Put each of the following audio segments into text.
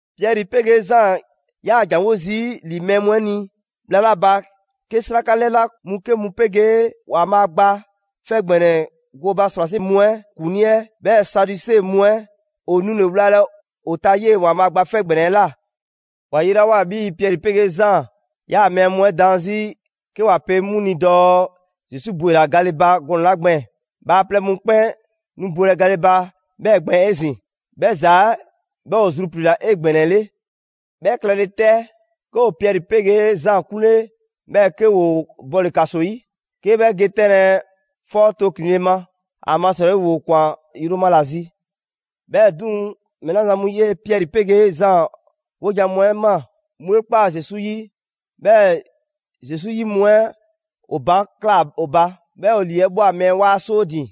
Piɛri 'pegee Zaan ‑yaa ‑janwo' zii' ‑li mɛɛ mu 'ɛ ni bhla 'la ba, 'ke 'sraka 'lɛna mu 'ke mu 'pegee ‑Waanbhaa' Gba 'Fɛ ‑Gbɛnɛ 'ɛ gooba ‑srwase' mu 'ɛ ‑kuŋlii 'ɛ, 'bhɛɛ‑ Saduse mu 'ɛ ‑o nule‑ wlalɛ ‑o ta 'yee‑ ‑Waanbhaa' Gba 'Fɛ ‑Gbɛnɛ 'ɛ ꞊la. ‑Wa yelawoa 'bhii‑ Piɛri 'pegee Zaan ‑yaa mɛɛ mu 'ɛ daan 'zi 'ke ‑wa pe 'mu ni dɔɔ Zesu ‑bwela gale ba gɔnɛ‑ 'la gbɛɛn‑, bhaaplɛŋ mu 'kpɛn nu bwelɛ gale ba 'bhɛɛ‑ gbɛɛn‑ 'ezin‑; 'bhɛ ‑za 'ɛ 'bhɛ ‑o zrupliila 'egbɛnɛle. 'Bhɛ klɛle 'tɛ, 'ke ‑o Piɛri 'pegee Zaan 'kunle 'bhɛɛ‑ 'ke ‑woo bɔle‑ ‑kaso 'yi, 'ke 'bhɛ ge 'tɛnlɛ‑ 'fɔ tooklinle ma; ‑amasrɔyi ‑woo ‑kwan yroma ‑la zi. 'Bhɛɛ‑ 'duŋ‑, mɛɛ 'la zan mu 'yee‑ Piɛri 'pegee Zaan 'wojan‑ mu 'ɛ ꞊maa, 'mu 'e ‑kpaa Zesu 'yi, 'bhɛɛ‑ Zesu 'yi mu 'ɛ ‑o baan' ꞊kla ‑o ba, 'bhɛɛ‑ ‑o ‑lii 'ɛ ꞊bhwa mɛɛ 'waa 'soo ‑din.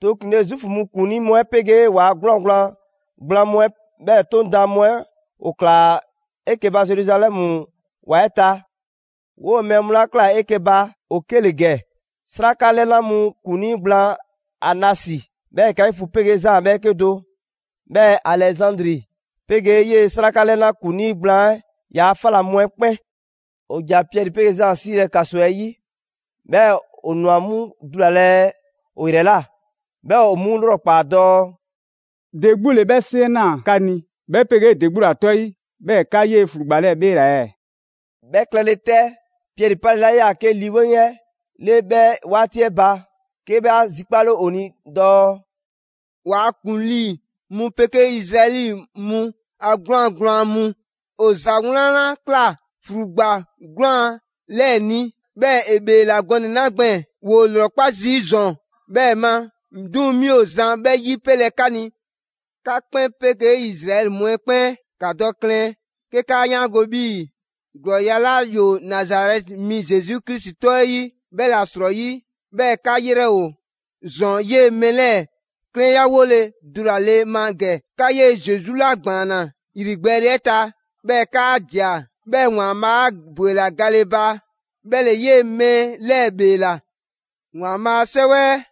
Too ‑klinle', Zuufu mu ‑kuŋlii mu 'ɛ 'pegee ‑waa' 'gwlaan‑ gblaan mu 'ɛ, 'bhɛɛ‑ 'Toŋ daan mu 'ɛ ‑o ꞊klaa 'eke‑ ba Zeruzalɛmu ‑wa 'ɛ ta. 'Woo‑ mɛɛ mu 'la ꞊klaa 'eke‑ ba, ‑o 'ke ‑le ‑gɛ: 'sraka 'lɛna mu ‑kuŋlii gblaan Anasi, 'bhɛɛ‑ Kaifu 'pegee Zaan 'bhɛɛke do; 'bhɛɛ‑ Alɛzandri 'pegee 'yee‑ 'sraka 'lɛna ‑kuŋlii gblaan 'ɛ ‑yaa' 'fa ‑la mu 'ɛ 'kpɛn. ‑O ‑ja Piɛri 'pegee Zaan 'siilɛ‑ ‑kaso 'ɛ 'yi, 'bhɛɛ‑ ‑o ‑nwa 'mu dulalɛ ‑o ‑yrɛ ꞊la; 'bhɛɛ‑ ‑o 'mu 'lrɔkpaa‑ dɔɔ: «‑De 'gbu ‑le 'bhɛ 'seŋ 'ɛ ꞊naa 'ka ni, 'bhɛ 'pegee ‑de 'gbu ‑la 'tɔ 'yi 'bhɛɛ‑ 'ka 'yee‑ ‑flugba 'lɛɛ‑ 'bheela‑ ɛɛ?» 'Bhɛ klɛle 'tɛ, Piɛri 'palela 'yaa‑ 'ke Lii 'Weŋ 'ɛ 'le 'bhɛ 'waati 'ɛ ba, 'ke 'bhɛ 'a zikpale ‑o ni dɔɔ: «'Waa‑ ‑kuŋlii mu 'pegee Izraɛli mu a 'gwlaan‑ gblaan mu! 'O ‑za 'wlan 'la ꞊kla ‑flugba 'gwlaan‑ 'lɛɛ‑ ni, 'bhɛɛ‑ ‑e ‑bheela gɔnɛ‑ 'la gbɛɛn‑; ‑woo' 'lrɔkpa zii' ‑zɔn 'bhɛɛ‑ ma, 'duŋ‑ 'mi ‑o zan 'bhɛ 'yipelɛ 'ka ni. 'Ka 'kpɛn 'pegee Izraɛli mu 'ɛ 'kpɛn, ‑ka dɔ klɛn 'ke 'kaa 'yaango 'bhii‑ ‑glɔɔya' 'la ‑yoo Nazarɛti mi Zesu Krisi 'tɔ 'ɛ 'yi, 'bhɛla‑ 'srɔyi 'bhɛɛ‑ 'ka 'yrɛ ‑o ‑zɔn 'yee‑ mɛɛ 'lɛɛ‑ 'klɛnyawole dulale ma ‑gɛ. 'Ka 'yee‑ Zesu 'la ‑gbaanna ‑yrigbɛɛle 'ɛ ta, 'bhɛɛ‑ 'kaa ꞊dia; 'bhɛɛ‑ ‑Waanbhaa' 'a ‑bwela gale ba 'bhɛ ‑le 'yee‑ mɛɛ 'lɛɛ‑ 'bheela‑. ‑Waanbhaa' a 'Sɛwɛ 'ɛ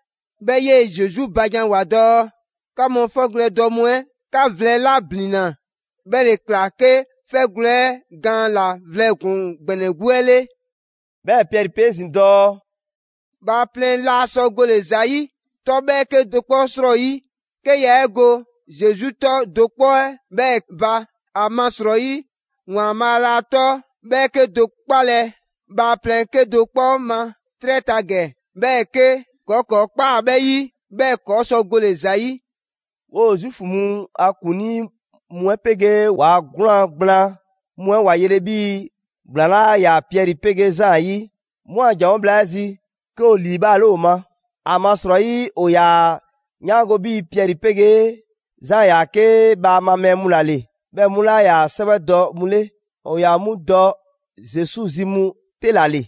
'bhɛ 'yee‑ Zesu ba janwoa‑ dɔɔ: ‹'Ka mu 'fɛgwlɛ‑ dɔ mu 'ɛ, 'ka vlɛ 'la ‑blinna; 'bhɛ ‑le ꞊kla 'ke 'fɛgwlɛ‑ 'ɛ gaan ‑la vlɛ ‑kpuŋ ‑gbɛnɛ 'gbu 'ɛ 'le.›» 'Bhɛɛ‑ Piɛri pe 'ezin‑ dɔɔ: «Bhaaplɛŋ laa sɔ gole‑ ‑za ‑yi 'tɔ 'bhɛɛke do 'kpɔ 'srɔyi, 'ke yaa 'e go Zesu 'tɔ do 'kpɔ 'ɛ 'bhɛɛ‑ ba. ‑Amasrɔyi ‑Waanbhaa' laa 'tɔ 'bhɛɛke do 'kpalɛ‑ bhaaplɛŋ 'kedo‑ 'kpɔ ma 'trɛ ta ‑gɛ, 'bhɛɛ‑ 'ke ‑kɔɔ' ‑kɔɔ' ꞊kpaa 'bhɛ 'yi, 'bhɛɛ‑ ‑kɔɔ' sɔ gole‑ ‑za 'yi.» 'Woo‑ Zuufu mu a ‑kuŋlii mu 'ɛ 'pegee ‑waa' 'gwlaan‑ gblaan mu 'ɛ ‑wa yele 'bhii‑ ‑gblaan 'laa ‑yaa Piɛri 'pegee Zaan 'yi, 'mu a ‑janwo' bhla 'ɛ zi, 'ke ‑o ‑liibhaale ‑o ma. ‑Amasrɔyi ‑o ‑yaa ‑a 'yaandɔ‑ 'bhii‑ Piɛri 'pegee Zaan yaa 'ke bhaama mɛɛ mu ‑la ‑le, 'bhɛɛ‑ 'mu 'laa ‑yaa 'sɛwɛdɔ mu 'le. ‑O ‑yaa 'mu dɔ Zesu zi mu 'te ‑la ‑le.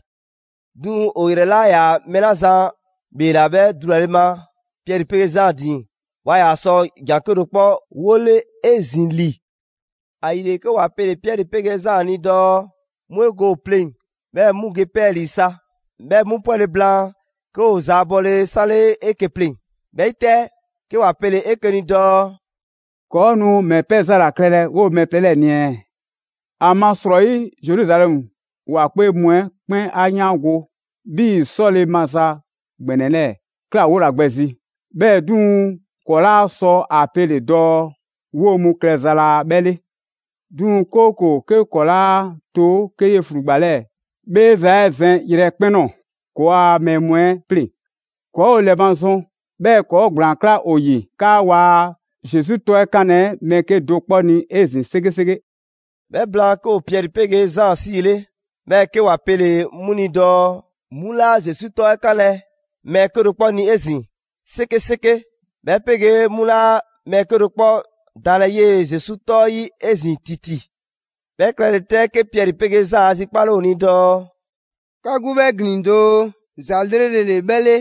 'Duŋ‑ ‑o ‑yrɛ 'la 'yaa‑ mɛɛ 'la zan 'bheela‑ 'bhɛ dulale ma Piɛri 'pegee Zaan ‑din, waa ‑yaa sɔ ‑jan 'kedo‑ 'kpɔ 'wole 'ezin‑ ‑li. ‑Ayile 'ke ‑wa pele‑ Piɛri 'pegee Zaan ni dɔɔ‑ 'mu 'e go ‑o pleŋ‑ 'bhɛɛ‑ 'mu ge 'pɛɛlii‑ sa. 'Bhɛ mu 'pwɛle‑ blaan, 'ke ‑o zaabɔle 'sanle 'eke‑ pleŋ‑. 'Bhɛ 'yi 'tɛ, 'ke ‑wa pele‑ 'eke‑ ni dɔɔ: «‑Kɔɔ' nu ‑mɛ pɛ za ‑la klɛlɛ 'woo‑ mɛɛ plɛ 'lɛɛ‑ ni ɛɛ? ‑Amasrɔyi Zeruzalɛmu ‑wa 'kpee mu 'ɛ 'kpɛn 'a 'yaango‑ 'bhii‑ 'sɔle‑ maza ‑gbɛnɛ 'lɛɛ‑ ꞊kla 'wola‑ gbɛ zi; 'bhɛɛ‑ 'duŋ‑ ‑kɔɔ' 'laa sɔ a pele‑ dɔɔ 'woo‑ mu klɛza laa 'bhɛ 'le. 'Duŋ‑, 'kooko‑ 'ke ‑kɔɔ' 'laa to 'ke 'yee‑ ‑flugba 'lɛɛ‑ 'bheeza‑ 'ɛ zɛn yrɛkpɛn‑ ꞊nɔɔ ‑kɔɔa' mɛɛ mu 'ɛ 'pleŋ, ‑kɔɔ' ‑o ‑lɛmazɔn, 'bhɛɛ‑ ‑kɔɔ' ‑gblaan 'kla ‑o ‑yi 'kaa waa Zesu 'tɔ 'ɛ 'kanlɛ‑ mɛɛ 'kedo‑ 'kpɔ ni 'ezin‑ 'sekeseke.» 'Bhɛ blaan, 'ke ‑o Piɛri 'pegee Zaan 'siile, 'bhɛɛ‑ 'ke ‑wa pele‑ 'mu ni dɔɔ 'mu 'laa Zesu 'tɔ 'ɛ 'kanlɛ‑ mɛɛ 'kedo‑ 'kpɔ ni 'ezin‑ 'sekeseke, 'bhɛ 'pegee 'mu 'laa mɛɛ 'kedo‑ 'kpɔ daanlɛ 'yee‑ Zesu 'tɔ 'ɛ 'yi 'ezin‑ ‑titi. 'Bhɛ klɛle 'tɛ, 'ke Piɛri 'pegee Zaan 'a zikpale ‑o ni dɔɔ: «'Ka 'gbu 'bhɛ ‑glin doo, ‑za 'lrele‑ ‑le 'bhɛ 'le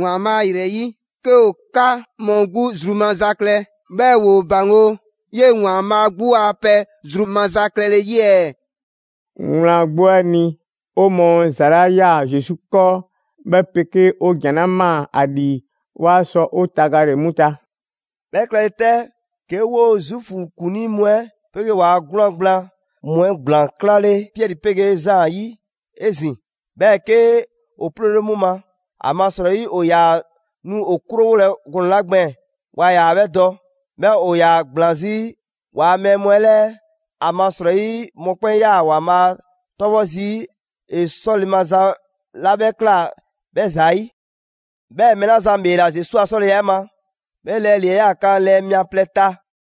‑Waanbhaa' ‑yrɛyi' 'ke 'o 'ka mu 'gbu zru maza klɛ, 'bhɛɛ‑ 'woo ‑baŋgo' 'yee‑ ‑Waanbhaa' 'gbu a pɛ zru maza klɛle 'yi ɛɛ? Wlan 'gbu 'ɛ ni, 'o mɔɔ ‑za 'la ꞊ya Zesu 'kɔɔ, 'bhɛ 'pegee 'o ‑jan 'la ꞊maa ‑a ‑lii, 'waa sɔ 'o tagale 'mu ta.» 'Bhɛ klɛle 'tɛ 'ke 'woo‑ Zuufu ‑kuŋlii mu 'ɛ 'pegee ‑waa' 'gwlaan‑ gblaan mu 'ɛ ‑gblaan 'klale Piɛri 'pegee Zaan 'yi 'ezin‑, 'bhɛɛ‑ 'ke ‑o 'ploole 'mu ma. ‑Amasrɔyi ‑o ‑yaa nu ‑o 'krowole gɔnɛ‑ 'la gbɛɛn‑, waa ‑yaa 'bhɛ dɔ. 'Bhɛɛ‑ ‑o ‑yaa ‑gblaan 'zi ‑waa' mɛɛ mu 'ɛ 'lɛɛ, ‑amasrɔyi mɔkpɛn' 'yaa ‑Waanbhaa' 'tɔbhɔ zii' ‑e 'sɔle‑ maza 'la 'bhɛ ꞊kla 'bhɛ ‑zayi'. 'Bhɛɛ‑ mɛɛ 'la zan ‑bheela Zesu a 'sɔleya 'ɛ ma, 'bhɛ lɛɛ ‑lii ‑yaa kan lɛɛ mia plɛ ta.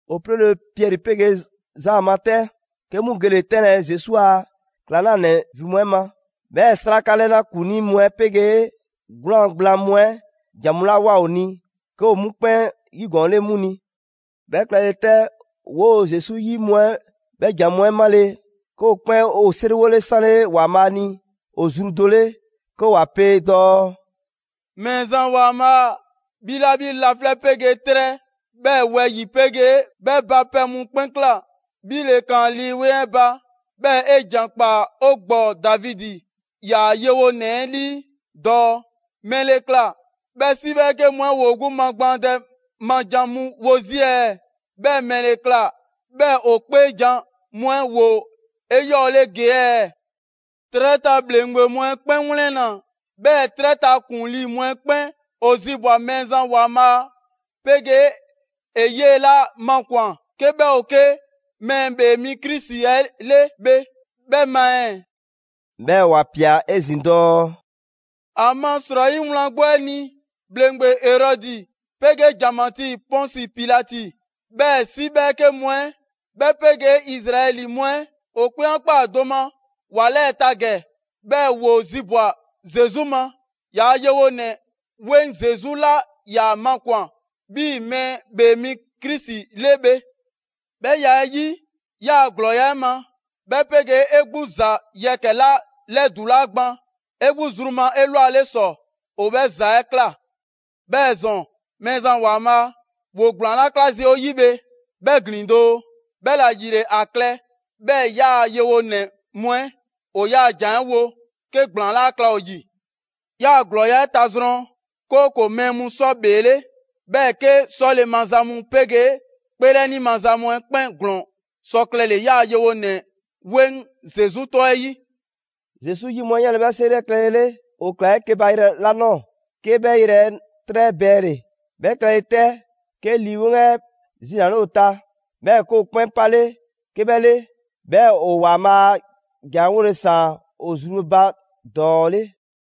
‑O 'ploole Piɛri 'pegee Zaan ma 'tɛ, 'ke 'mu gele‑ 'tɛnlɛ‑ Zesu a ‑klaŋlanɛ ‑vin mu 'ɛ ma. 'Bhɛɛ‑ 'sraka 'lɛna ‑kuŋlii mu 'ɛ 'pegee 'gwlaan‑ gblaan mu 'ɛ ‑jan mu 'la ꞊woa ‑o ni, 'ke ‑o 'mu 'kpɛn 'yigɔɔnle 'mu ni. 'Bhɛ klɛle 'tɛ, 'woo‑ Zesu 'yi mu 'ɛ 'bhɛ ‑jan mu 'ɛ 'male‑, 'ke ‑o 'kpɛn ‑o 'seriwole 'sanle ‑Waanbhaa' ni ‑o zru do 'le 'ke ‑wa pe dɔɔ: «Mɛɛzan ‑Waanbhaa', 'bhi 'la 'bhi laflɛ' 'pegee 'trɛ, 'bhɛɛ‑ wɛyi‑ 'pegee 'bhɛ ba pɛ mu 'kpɛn ꞊kla, 'Bhi ‑le ꞊kaan Lii 'Weŋ 'ɛ ba, 'bhɛɛ‑ 'e ‑jan ꞊kpaa 'o ‑gbɔɔ Davidi, 'yaa‑ yewonɛ 'ɛ 'lii dɔɔ: ‹‑Mɛle ꞊kla 'bhɛɛ‑ 'si 'bhɛɛke mu 'ɛ ‑woo gbu magbaandɛ ma jan mu wo zii' ɛɛ? 'Bhɛɛ‑ ‑mɛle ꞊kla 'bhɛɛ‑ ‑o 'kpeejan‑ mu 'ɛ ‑woo 'eyɔɔle ‑gee' ɛɛ? 'Trɛ ta ‑bhleŋgbe mu 'ɛ 'kpɛn 'wlɛnna‑, 'bhɛɛ‑ 'trɛ ta ‑kuŋlii mu 'ɛ 'kpɛn ‑o zibwa‑ Mɛɛzan ‑Waanbhaa' 'pegee ‑e 'yee‑ 'la makwan‑ 'ke 'bhɛ ‑o 'ke Mɛɛ ‑Bhee Mi Krisi 'ɛ 'le bhe 'bhɛ ma ɛɛ?›» 'Bhɛɛ‑ ‑wa ꞊pia 'ezin‑ dɔɔ: «‑Amasrɔyi wlan 'gbu 'ɛ ni, ‑bhleŋgbe Erɔdi 'pegee ‑janmatii Pɔnsi Pilati, 'bhɛɛ‑ 'si 'bhɛɛke mu 'ɛ, 'bhɛ 'pegee Izraɛli mu 'ɛ ‑o 'kpɛn 'a ꞊kpaa do ma ‑wa 'lɛɛ‑ ta ‑gɛ; 'bhɛɛ‑ ‑woo zibwa‑ Zesu ma, 'yaa‑ yewonɛ 'weŋ Zesu 'la 'ya makwan‑ 'bhii Mɛɛ ‑Bhee Mi Krisi 'le bhe. 'Bhɛ ya 'ɛ 'yi, 'yaa‑ ‑glɔɔya' 'ɛ ma, 'bhɛ 'pegee 'e 'gbu ‑za yɛkɛ‑ 'la 'lɛdulaa gban 'e 'gbu zru ma 'elwale ‑sɔ, ‑o 'bhɛɛ‑ ‑za 'ɛ ꞊kla. 'Bhɛɛ‑ ‑zɔn, Mɛɛzan ‑Waanbhaa', ‑woo' ‑gblaan 'la 'kla zii' 'o 'yi bhe, 'bhɛ ‑glin doo; 'bhɛla‑ ‑yile ‑a klɛ 'bhɛɛ‑ 'yaa‑ yewonɛ mu 'ɛ ‑o 'yaa‑ ‑jan 'ɛ 'wo 'ke ‑gblaan 'laa klɛ ‑o ‑yi. 'Yaa‑ ‑glɔɔya' 'ɛ tazrɔn, 'kooko‑ mɛɛ mu sɔ ‑bheele', 'bhɛɛ‑ 'ke 'sɔle‑ maza mu 'pegee 'kpeelɛni maza mu 'ɛ 'kpɛn ‑glɔɔn sɔ klɛle‑ 'yaa‑ yewonɛ 'weŋ Zesu 'tɔ 'ɛ 'yi.» Zesu 'yi mu 'ɛ 'yanle‑ 'bhɛ 'seri 'ɛ klɛlele, ‑o ꞊klaa 'eke‑ ba yrɛ 'la ꞊nɔɔ, 'ke 'bhɛ yrɛ 'ɛ 'trɛ 'ɛ bɛɛnle‑. 'Bhɛ klɛle 'te, 'ke Lii 'Weŋ 'ɛ zinale ‑o ta, 'bhɛɛ‑ 'ke ‑o 'kpɛn 'pale 'ke 'bhɛ 'le. 'Bhɛɛ‑ ‑o ‑Waanbhaa' a ‑jan 'ɛ 'wole‑ ‑saan ‑o zru ba ‑dɔɔ 'le.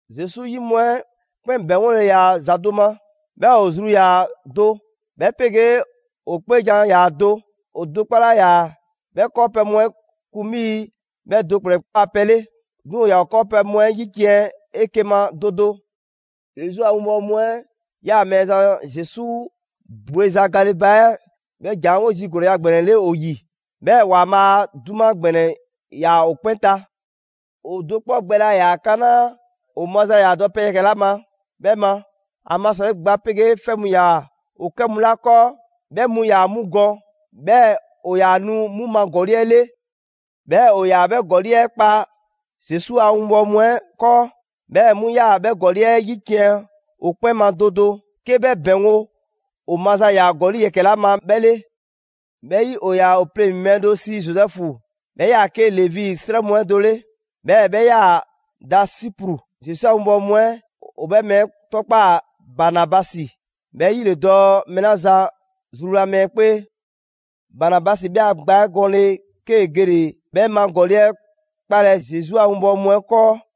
Zesu 'yi mu 'ɛ 'kpɛn ‑bɛŋgole ‑yaa ‑za do ma, 'bhɛɛ‑ ‑o zru ‑yaa do, 'bhɛ 'pegee‑ ‑o 'kpeejan‑ ‑yaa do. ‑O do 'kpɔ 'laa ‑yaa 'bhɛ 'kɔɔpɛ‑ mu 'ɛ kun 'bhii‑ 'bhɛ do ‑kplɛn ‑a pɛ 'le. 'Duŋ‑ ‑o ‑yaa ‑o 'kɔɔpɛ‑ mu 'ɛ 'yiciɛn‑ 'eke‑ ma do do. Zesu a winbɔwo mu 'ɛ ‑yaa Mɛɛzan Zesu bweza gale ba 'ɛ 'bhɛ ‑jan 'ɛ 'wo zii' ‑glɔɔya' ‑gbɛnɛ 'le ‑o ‑yi. 'Bhɛɛ‑ ‑Waanbhaa' a 'duma ‑gbɛnɛ ꞊yaa ‑o 'kpɛn ta. ‑O do 'kpɔ gbɛ laa ‑yaa kanaa' ‑o maza ‑yaa dɔ pɛ yɛkɛ‑ 'la ma 'bhɛ ba. ‑Amasrɔyi, gba 'pegee 'fɛ mu ‑yaa ‑o 'kɛ mu 'la 'kɔɔ, 'bhɛ mu ‑yaa 'mu gɔn 'bhɛɛ‑ ‑o ‑yaa nu 'mu ma ‑gɔli' 'ɛ 'le. 'Bhɛɛ‑ ‑o ‑yaa 'bhɛ ‑gɔli' 'ɛ kpa Zesu a 'winbɔwo mu 'ɛ 'kɔɔ. 'Bhɛɛ‑ 'mu ꞊yaa 'bhɛ ‑gɔli' 'ɛ 'yiciɛn‑ o 'kpɛn ma do do, 'ke 'bhɛ ‑bɛŋgo' ‑o maza ‑yaa ‑gɔli' yɛkɛ‑ 'la ma, 'bhɛ 'le. 'Bhɛ 'yi, ‑o ‑yaa ‑o pleŋ‑ mɛɛ do sii Zozɛfu, 'bhɛ 'yaa‑ 'ke Levi 'srɛ mu 'ɛ do 'le; 'bhɛɛ‑ 'bhɛ 'yaa‑ da Sipru. Zesu a 'winbɔwo mu 'ɛ ‑o 'bhɛ mɛɛ 'ɛ 'tɔkpaa‑ Banabasi, ('bhɛ 'yi ‑le dɔɔ: mɛɛ 'la zan zruwla mɛɛ 'kpee). Banabasi 'bhɛ a gba 'ɛ gɔnle‑, 'kee‑ gele‑ 'bhɛ ma ‑gɔli' 'ɛ 'kpalɛ‑ Zesu a 'winbɔwo mu 'ɛ 'kɔɔ.